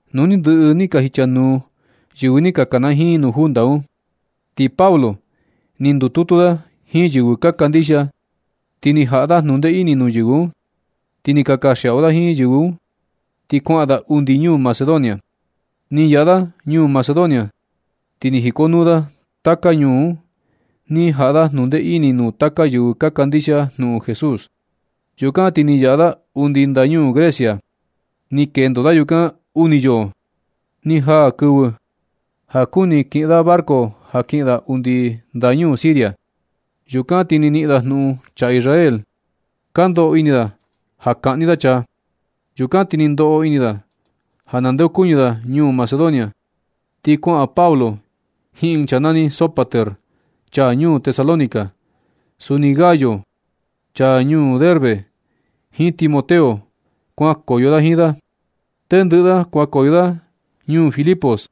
Nu ni ndɨꞌɨ ni ka jicha nuu yɨvɨ ni ka kanajiin nuu junta un. Ti Pablo ni ndututu da jiin yɨvɨ ka kandixia, ti ni jaꞌa da jnundee ini nuu yɨvɨ un, ti ni ka kanxiaꞌu da jiin yɨvɨ un ti kuaꞌan da undi ñuu Macedonia. Ni yaꞌa da ñuu Macedonia ti ni jikonuu da taka ñuu un ni jaꞌa da jnundee ini nuu taka yɨvɨ ka kandixia jnuꞌun Jesús. Yukan ti ni yaꞌa da undi ndañuu Grecia. Ni kendo da yukan uni yoo. Ni jaa ɨɨn kɨvɨ ja kuni kiꞌin da barco ja kiꞌin da undi ndañuu Siria. Yukan ti ni niꞌin da jnuꞌun chaa Israel ka ndoꞌo ini da ja kaꞌni da chaa. Yukan ti ni ndoꞌo ini da ja nandeokuñɨ da ñuu Macedonia. Ti kuaꞌan Pablo jiin ɨɨn chaa nani Sópater, chaa ñuu Tesalónica. Suni Gayo, chaa ñuu Derbe, jiin Timoteo kuankoyo da jiin da. Tendɨꞌɨ da kuankoyo da ñuu Filipos.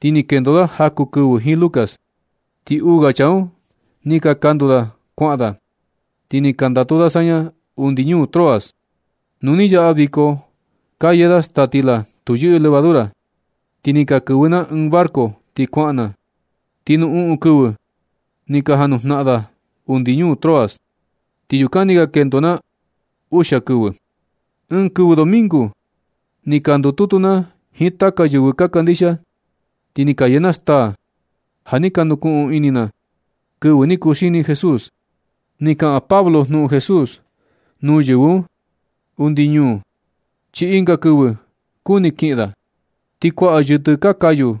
Ti ni kendo da jaku kɨvɨ jiin Lucas, ti uu ga chaa un ni ka kandu da kuaꞌan da. Ti ni ka ndatu da saña undi ñuu Troas. Nu ni yaꞌa viko ka yee da staa stila tu yɨꞌɨ levadura, ti ni ka kɨvɨ na ɨɨn barco ti kuaꞌan na. Ti nuu uꞌun kɨvɨ ni ka janujnaꞌan naa da undi ñuu Troas, ti yukan ni ka kendo na uxia kɨvɨ. Ɨɨn kɨvɨ domingo ni ka ndututu na jiin taka yɨvɨ ka kandixia, ti ni ka yee na staa ja ni ka nukuꞌun ini na kɨvɨ ni kuxini Jesús. Ni kaꞌan Pablo jnuꞌun Jesús nuu yɨvɨ un undi ñuu, chi ɨnga kɨvɨ kuni kiꞌin da. Ti kuaꞌa yɨtɨ ka kayu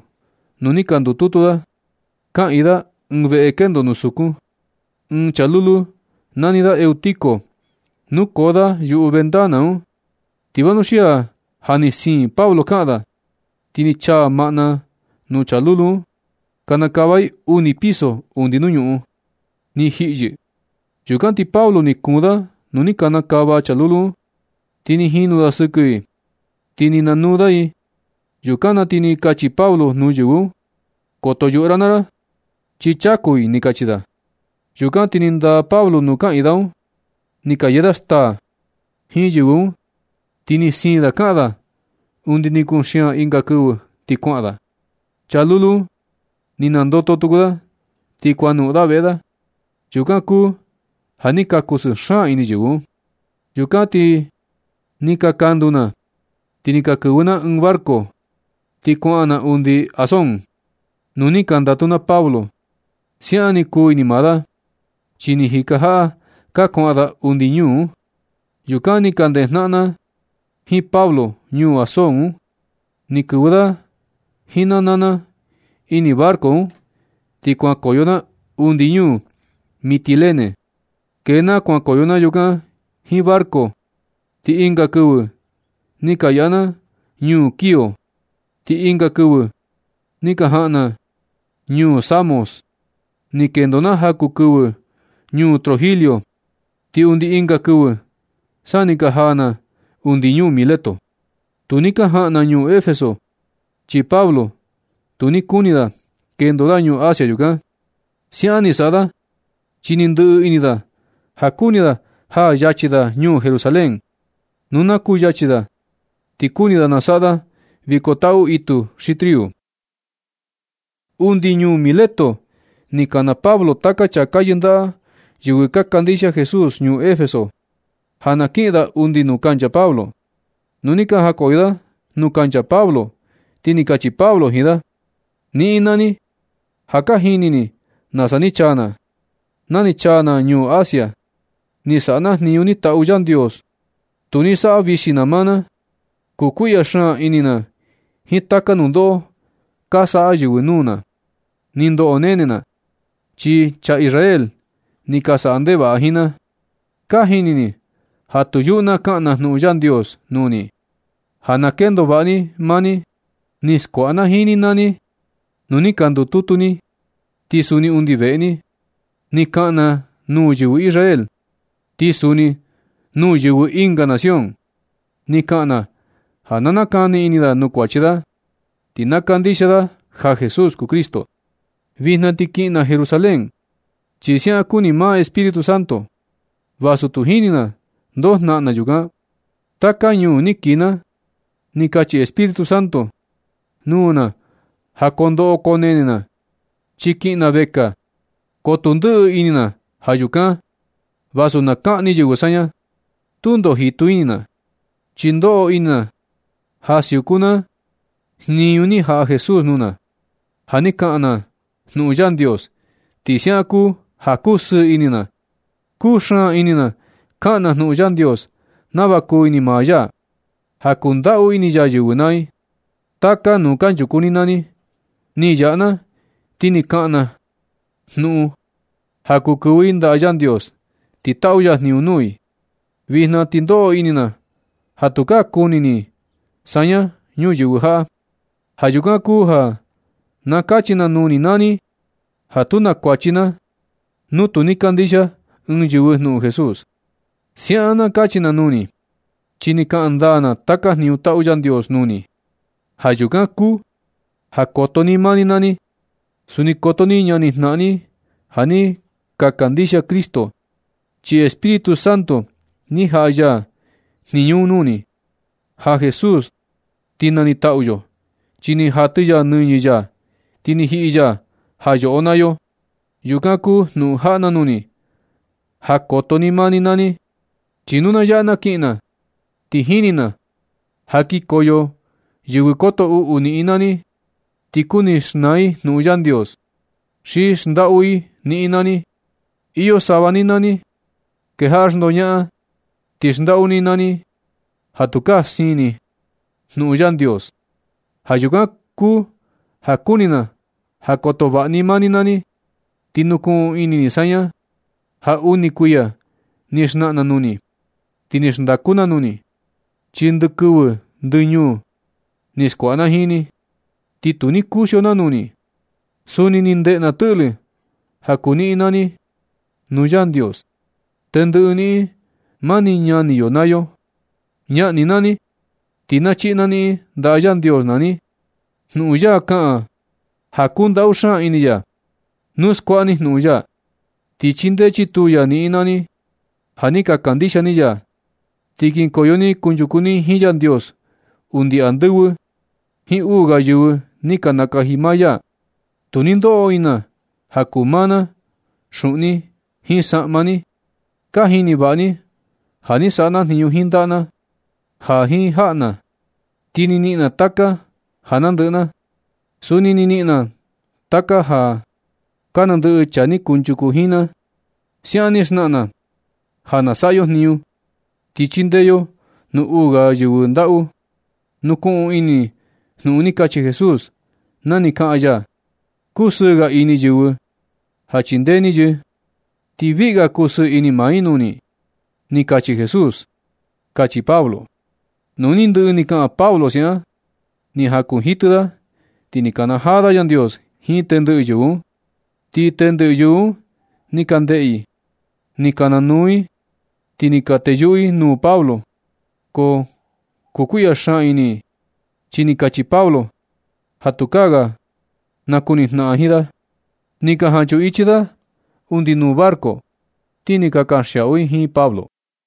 nuu ni ka ndututu da, kaꞌiin da ɨɨn veꞌe kendo nuu sukun. Ɨɨn chaa lulu nani da Eutico, nukoo da yuꞌu ventana un. Ti vanuxia ja ni siin Pablo kaꞌan da, ti ni chaa maꞌna nuu chaa lulu un, ti ni kanakava i. Kanakava i uni piso undi nuu ñuꞌun. Ni jiꞌi yɨ. Yukan ti Pablo ni kuun da nuu ni kanakava chaa lulu un, ti ni jinu da sɨkɨ i, ti ni nanuu da i. Yukan na ti ni kachi Pablo nuu yɨvɨ un: ―Koto yuꞌu ra naa ra, chi chaku i ―ni kachi da. Yukan na ti ni ndaa Pablo nuu kaꞌiin da un. Ni ka yee da staa jiin yɨvɨ un, ti ni siin da kaꞌan da undi ni kuxian ɨnga kɨvɨ ti kuaꞌan da. Chaa lulu un ni nandoto tuku da, ti kuanoꞌon da veꞌe da. Yukan kuu ja ni ka kusɨɨ xaan ini yɨvɨ un. Yukan ti ni ka kandu na, ti ni ka kɨvɨ na ɨɨn barco. Ti kuaꞌan na undi Asón, nuu ni ka ndatu na Pablo. Siaꞌan ni kuu ini maa da, chi ni jika jaꞌa ka kuaꞌan da undi ñuu un. Yukan ni ka ndejnaꞌan na jiin Pablo ñuu Asón un. Ni kɨvɨ da jiin na naa na ini barco un, ti kuankoyo na undi ñuu Mitilene. Kee na kuankoyo na yukan jiin barco, ti ɨnga kɨvɨ ni ka yaꞌa na ñuu Quío, ti ɨnga kɨvɨ ni ka jaꞌan na ñuu Samos. Ni kendo na jaku kɨvɨ ñuu Trogilio, ti undi ɨnga kɨvɨ sa ni ka jaa na undi ñuu Mileto. Tu ni ka jaꞌan na ñuu Efeso, chi Pablo tu ni kuni da kendo da ñuu Asia yukan. Siaꞌan ni saꞌa da, chi ni ndɨꞌɨ ini da ja kuni da jaa yachi da ñuu Jerusalén. Nu na kuu yachi da, ti kuni da nasaꞌa da viko taꞌu itu xi triu. Undi ñuu Mileto ni kana Pablo taka chaa ka yɨndaꞌa yɨvɨ ka kandixia Jesús ñuu Efeso, ja na kiꞌin da undi nuu kancha Pablo. Nu ni ka jakoyo da nuu kancha Pablo, ti ni kachi Pablo jiin da: ―Niꞌin naa ni, ja ka jini ni nasa ni chaa na, na ni chaa na ñuu Asia. Ni saꞌa na jniñu ni taꞌu Yandios. Tu ni saꞌa vixi na maa na. Kukuiꞌya xaan ini na jiin taka nundoꞌo ka saꞌa yɨvɨ nuu na. Ni ndoꞌo nene na, chi chaa Israel ni ka saꞌa ndevaꞌa da jiin na. Ka jini ni ja tu yuꞌu na kaꞌan na jnuꞌun Yandios nuu ni, ja na kendo vaꞌa ni naa ni. Ni skuaꞌa na jiin ni naa ni nu ni ka ndututu ni, ti suni undi veꞌe ni. Ni kaꞌan na nuu yɨvɨ Israel, ti suni nuu yɨvɨ ɨnga nación. Ni kaꞌan na ja na nakani ini da nuu kuachi da, ti na kandixia da ja Jesús kuu Cristo. Vijna ti kiꞌin na Jerusalén, chi siaꞌan kuni maa Espíritu Santo, vasu tu jini na ndoo jnaꞌan na yukan. Taka ñuu ni kii na, ni kachi Espíritu Santo nuu na ja koo ndoꞌo koo nene na, chi kiꞌin na vekaa. Ko tu ndɨꞌɨ ini na ja yukan. Vasu na kaꞌni yɨvɨ saña, tundo jitu ini na, chi ndoꞌo ini ja siuku na jniñu ni jaꞌa Jesús nuu na, ja na kaꞌan na jnuꞌun Yandios. Ti siaꞌan kuu ja kusɨɨ ini na. Kuu xaan ini na kaꞌan na jnuꞌun Yandios nava kuu ini maa ya, ja kundaꞌu ini ya yɨvɨ naa i. Taka nuu kanchuku ni na ni yaꞌa na, ti ni kaꞌan na jnuꞌun ja kuu kɨvɨ i ndaꞌa Yandios ti taꞌu ya jniñu nuu i. Vijna ti ndoꞌo ini na ja tukaa kuni ni saña ñuyɨvɨ jaꞌa. Ja yukan kuu ja na kachi na nuu ni naa ni, ja tu na kuachi na nu tu ni kandixia ni ɨɨn yɨvɨ jnuꞌun Jesús. Siaꞌan na kachi na nuu ni, chi ni kaꞌan ndaa na taka jniñu taꞌu Yandios nuu ni. Ja yukan kuu ja koto ni maa ni naa ni. Suni koto ni ñanijnaꞌan ni ja ni kandixia Cristo, chi Espíritu Santo ni jaꞌa ya jniñu un nuu ni. Ja Jesús ti nanitaꞌu yo, chi ni jatɨ ya nɨñɨ ya ti ni jiꞌi ya ja yoꞌo naa yo. Yukan kuu jnuꞌun jaꞌa na nuu ni, ja koto ni maa ni naa ni. Chi nu na yaꞌa na kiꞌin na, ti jini na ja kikoyo yɨvɨ koto uꞌu niꞌin naa ni, ti kuni xnaa i jnuꞌun Yandios, ti xndaꞌu i niꞌin naa ni. Iyo sava ni naa ni kejaꞌa xndoñaꞌan, ti xndaꞌu ni naa ni ja tukaa siin ni jnuꞌun Yandios. Ja yukan kuu ja kuni na ja koto vaꞌa ni maa ni naa ni. Ti nukuꞌun ini ni saña ja uni kuiya ni xnaꞌan na nuu ni, ti ni xndaku na nuu ni, chi ndɨ kɨvɨ ndɨ ñuu ni skuaꞌa na jiin ni, ti tu ni kuxio na nuu ni. Suni ni ndeꞌe na tɨꞌlɨ ja kuu niꞌin naa ni nuu Yandios. Tendɨꞌɨ niꞌin, mani ñani yo naa yo, ñaꞌan ni naa ni ti na chiꞌi na niꞌin ndaꞌa Yandios naa ni. Jnuꞌun ya kaꞌan ja kundaꞌu xaan ini ya. Nu skuaꞌa ni jnuꞌun ya, ti chindee chitu ya niꞌin naa ni ja ni ka kandixia ni ya. Ti kinkoyo ni kunchuku ni jiin Yandios undi andɨvɨ jiin uu ga yɨvɨ ni nakaji maa ya. Tu ni ndoꞌo ini na ja kuu maa na xuꞌun ni, jiin saꞌma ni. Ka jini vaꞌa ni ja ni saꞌa na jniñu jiin ndaꞌa na jiin jaꞌa na, ti ni niꞌin na taka ja nandɨꞌɨ na. Suni ni niꞌin na taka ja ka nandɨꞌɨ chaa ni kunchuku jiin na. Siaꞌan ni xnaꞌan na, ja na saꞌa yo jniñu, ti chindee yo nuu uu ga yɨvɨ ndaꞌu. Nukuꞌun ini ni jnuꞌun ni kachi Jesús, na ni kaꞌan ya: “Kusɨɨ ga ini yɨvɨ ja chindee ni yɨ, ti viꞌi ga kusɨɨ ini maa ni nuu i”, ni kachi Jesús ―kachi Pablo. Nu ni ndɨꞌɨ ni kaꞌan Pablo siaꞌan, ni jakunjitɨ da, ti ni kanajaa da Yandios jiin tendɨꞌɨ yɨvɨ un. Ti tendɨꞌɨ yɨvɨ un ni ka ndeꞌe i. Ni ka nanuu i, ti ni ka teyuꞌu i nuu Pablo. Ko kukuiꞌya xaan ini i, chi ni kachi Pablo ja tukaa nakunijnaꞌan i jiin da. Ni ka jan chuꞌun ichi i da undi nuu barco, ti ni ka kanxiaꞌu i jiin Pablo.